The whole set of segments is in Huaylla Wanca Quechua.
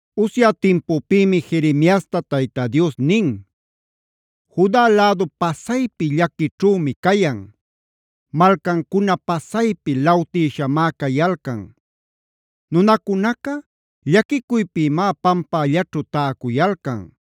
Usya timpupïmi Jeremiasta Tayta Dios nin: “Juda lädu pasaypi llaquićhümi cayan; malcancuna pasaypi lawtïshamá cayalcan. Nunacunaca llaquicuypïmá pampällaćhu täcuyalcan.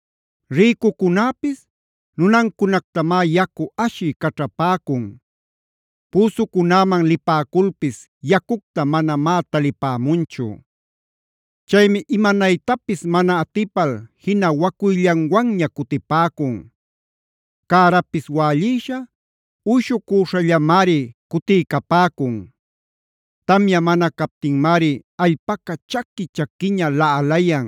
Rïcucunäpis nunancunactamá yacu ashï caćhapäcun; püsucunäman lipäculpis yacucta manamá talipämunchu. Chaymi imanaytapis mana atipal jina wacuyllanwanña cutipäcun; cärapis wällïsha, uyshucuśhallamari cutiycapäcun. Tamya mana captinmari allpaca chaqui-chaquiña laꞌalayan.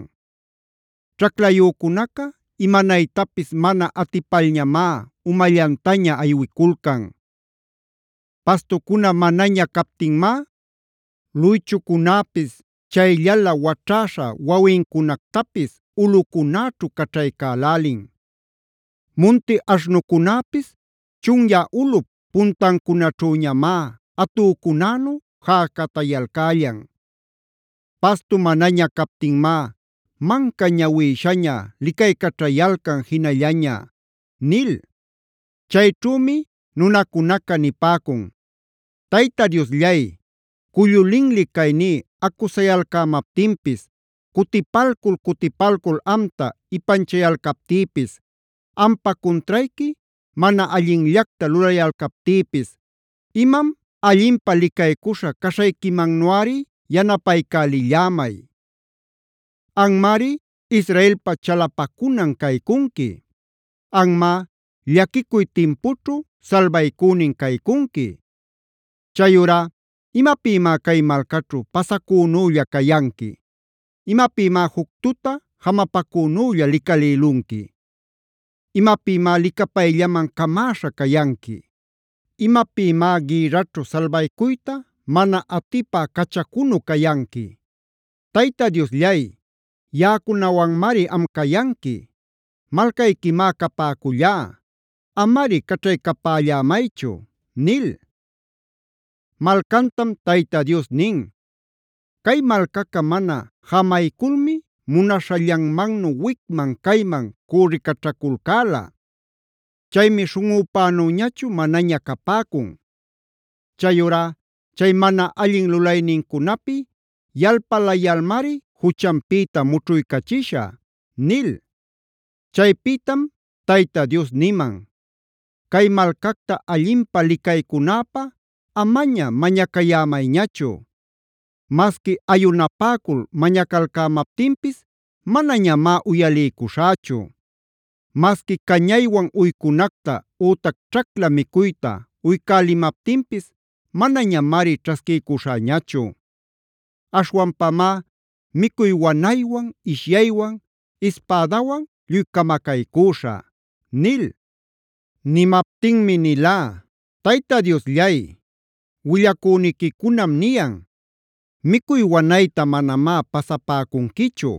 Ćhaclayücunaca imanaytapis mana atipalñamá umallantaña aywiculcan. Pastucuna manaña captinmá luychucunäpis chayllalä waćhäśha wawincunactapis ulꞌucunäćhu caćhaycälälin. Munti aśhnucunäpis chunyä ulꞌup puntancunaćhüñamá atücunänu jäcatayalcällan. Pastu manaña captinmá manca ñawïśhaña licaycaćhayalcan jinallaña” nil. Chayćhümi nunacunaca nipäcun: “Tayta Diosllay, cullu linli cayní acusayalcämaptinpis, cutipalcul-cutipalcul amta ipanchayalcaptïpis, ampa cuntrayqui mana allinllacta lulayalcaptïpis, imam allinpä licaycuśha caśhayquimannuꞌari yanapaycälillämay. Anmari, Israelpa chalapacunan caycunqui; anmá, llaquicuy timpućhu salbaycünin caycunqui. Chayurá ¿imapïmá cay malcaćhu pasacünülla cayanqui? ¿Imapïmá juc tuta jamapacünülla licalïlunqui? ¿Imapïmá licapayllaman camäśha cayanqui? ¿Imapïmá gïrraćhu salbaycuyta mana atipä cachacunu cayanqui? Tayta Diosllay, yaꞌacunawanmari am cayanqui; malcayquimá capäcullá. Amari caćhaycapällämaychu” nil. Malcantam Tayta Dios nin: “Cay malcaca mana jamayculmi munaśhallanmannu wicman-cayman cürricaćhaculcäla. Chaymi śhunꞌüpänüñachu manaña capäcun. Chayurá chay mana allin lulaynincunapi yalpalayalmari juchanpïta mućhuycachishä” nil. Chaypïtam Tayta Dios niman: “Cay malcacta allinpä licaycunäpä amaña mañacayämayñachu. Masqui ayunapäcul mañacalcämaptinpis manañamá uyaliycuśhächu. Masqui cañaywan uycunacta ütac ćhacla micuyta uycälimaptinpis manañamari ćhasquiycuśhäñachu. Aśhwanpamá micuy wanaywan, ishyaywan, ispädawan lluy camacaycüśhä” nil. Nimaptinmi nilá: “Tayta Diosllay, willacüniquicunam niyan: ‘Micuy wanayta manamá pasapäcunquichu;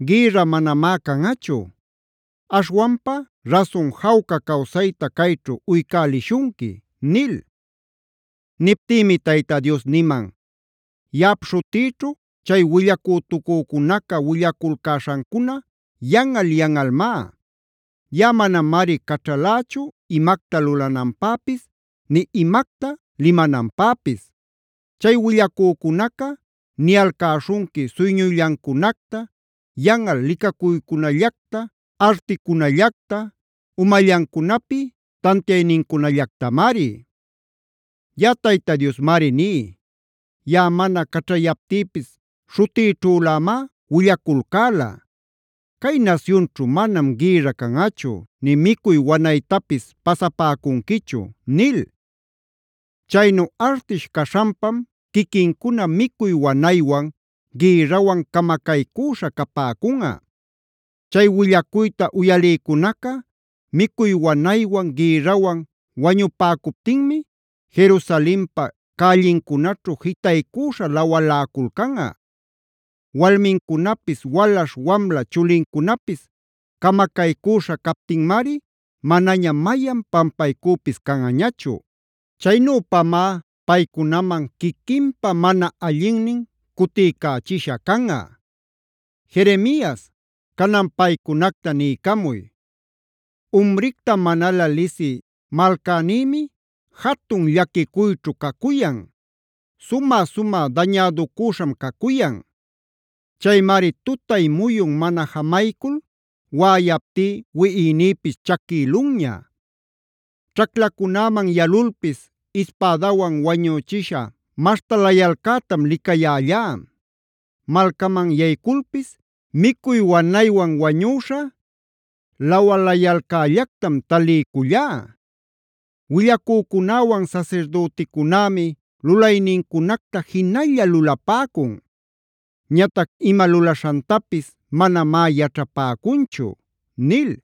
gïrra manamá canꞌachu. Aśhwanpa rasun jawca cawsayta cayćhu uycälishunqui’” nil. Niptïmi Tayta Dios niman: “Yaꞌap śhutïćhu chay willacütucücunaca willaculcäśhancuna yanꞌal-yanꞌalmá. Yaꞌa manamari caćhalächu imacta lulananpäpis, nï imacta limananpäpis. Chay willacücunaca niyalcäśhunqui suyñuyllancunacta, yanꞌal licacuycunallacta, articunallacta, umallancunapi tantiaynincunallactamari. “Yaꞌa Tayta Diosmari ní: Yaꞌa mana caćhayaptïpis śhutïćhülämá willaculcäla: ‘Cay nasyunćhu manam gïrra canꞌachu, nï micuy wanaytapis pasapäcunquichu’ nil. Chaynu artish caśhanpam quiquincuna micuy wanaywan, gïrrawan camacaycüśhä capäcunꞌa. Chay willacuyta uyalïcunaca micuy wanaywan, gïrrawan wañupäcuptinmi Jerusalenpa cällincunaćhu jitaycüśha lawaläculcanꞌa. Walmincunapis, walaśh wamla chulincunapis camacaycüśha captinmari manaña mayan pampaycüpis canꞌañachu. Chaynüpamá paycunaman quiquinpa mana allinnin cutiycächisha canꞌa. Jeremias, canan paycunacta niycamuy: “ ‘Umricta manalä lisï malcänïmi jatun llaquicuyćhu cacuyan; sumä-sumä dañäducüśham cacuyan. Chaymari tutay muyun mana jamaycul waꞌayaptí, wiꞌinïpis chaquïlunña. Ćhaclacunäman yalulpis ispädawan wañüchisha maśhtalayalcätam licayällá. Malcaman yayculpis micuy wanaywan wañüśha lawayalcällactam taliycullá. Willacücunäwan sasirdüticunämi lulaynincunacta jinalla lulapäcun; ñatac ima lulaśhantapis manamá yaćhapäcunchu’” nil.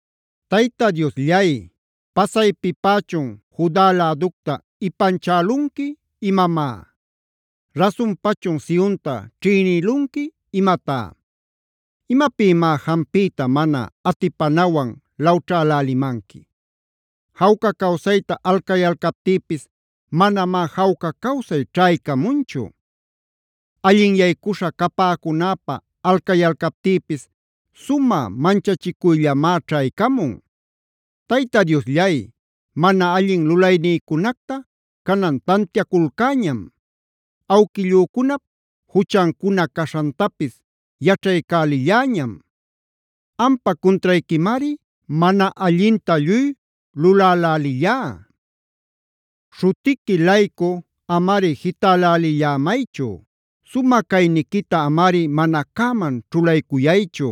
Tayta Diosllay, ¿pasaypipächun Juda läducta ipanchälunqui imamá? ¿Rasunpachun Sionta ćhïnïlunqui imatá? ¿Imapïmá jampiyta mana atipanawan lawćhälälimanqui? Jawca cawsayta alcayalcaptïpis manamá jawca cawsay ćhaycamunchu. Allinyaycuśha capäcunäpä alcaycäliptïpis sumä manchachicuyllamá ćhaycamun. Tayta Diosllay, mana allin lulaynïcunacta canan tantiaculcäñam; awquillücunap juchancuna caśhantapis yaćhaycälilläñam. Ampa cuntrayquimari mana allinta lluy lulälälillá. Śhutiquita-laycu amari jitälälillämaychu; sumä cayniquita amari mana cäman ćhulaycuyaychu.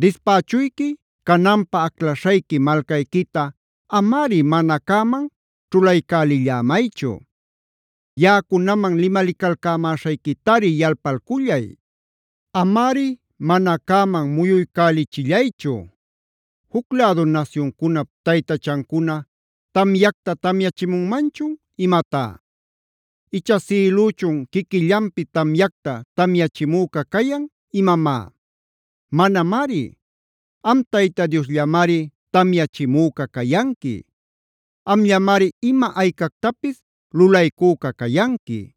Dispächuyqui cananpä aclaśhayqui malcayquita amari mana cäman ćhulaycälillämaychu. Yaꞌacunaman limalicalcämäśhayquitari yalpalcullay. Amari mana cäman muyuycälichillaychu. ¿Juc lädu nasyuncunap taytachancuna tamyacta tamyachimunmanchun imatá? ¿Icha sïlüchun quiquillanpi tamyacta tamyachimüca cayan imamá? Manamari. Am Tayta Diosllamari tamyachimüca cayanqui; amllamari ima aycactapis lulaycüca cayanqui.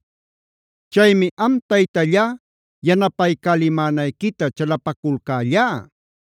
Chaymi am Taytallá yanapaycälimänayquita chalapaculcällá.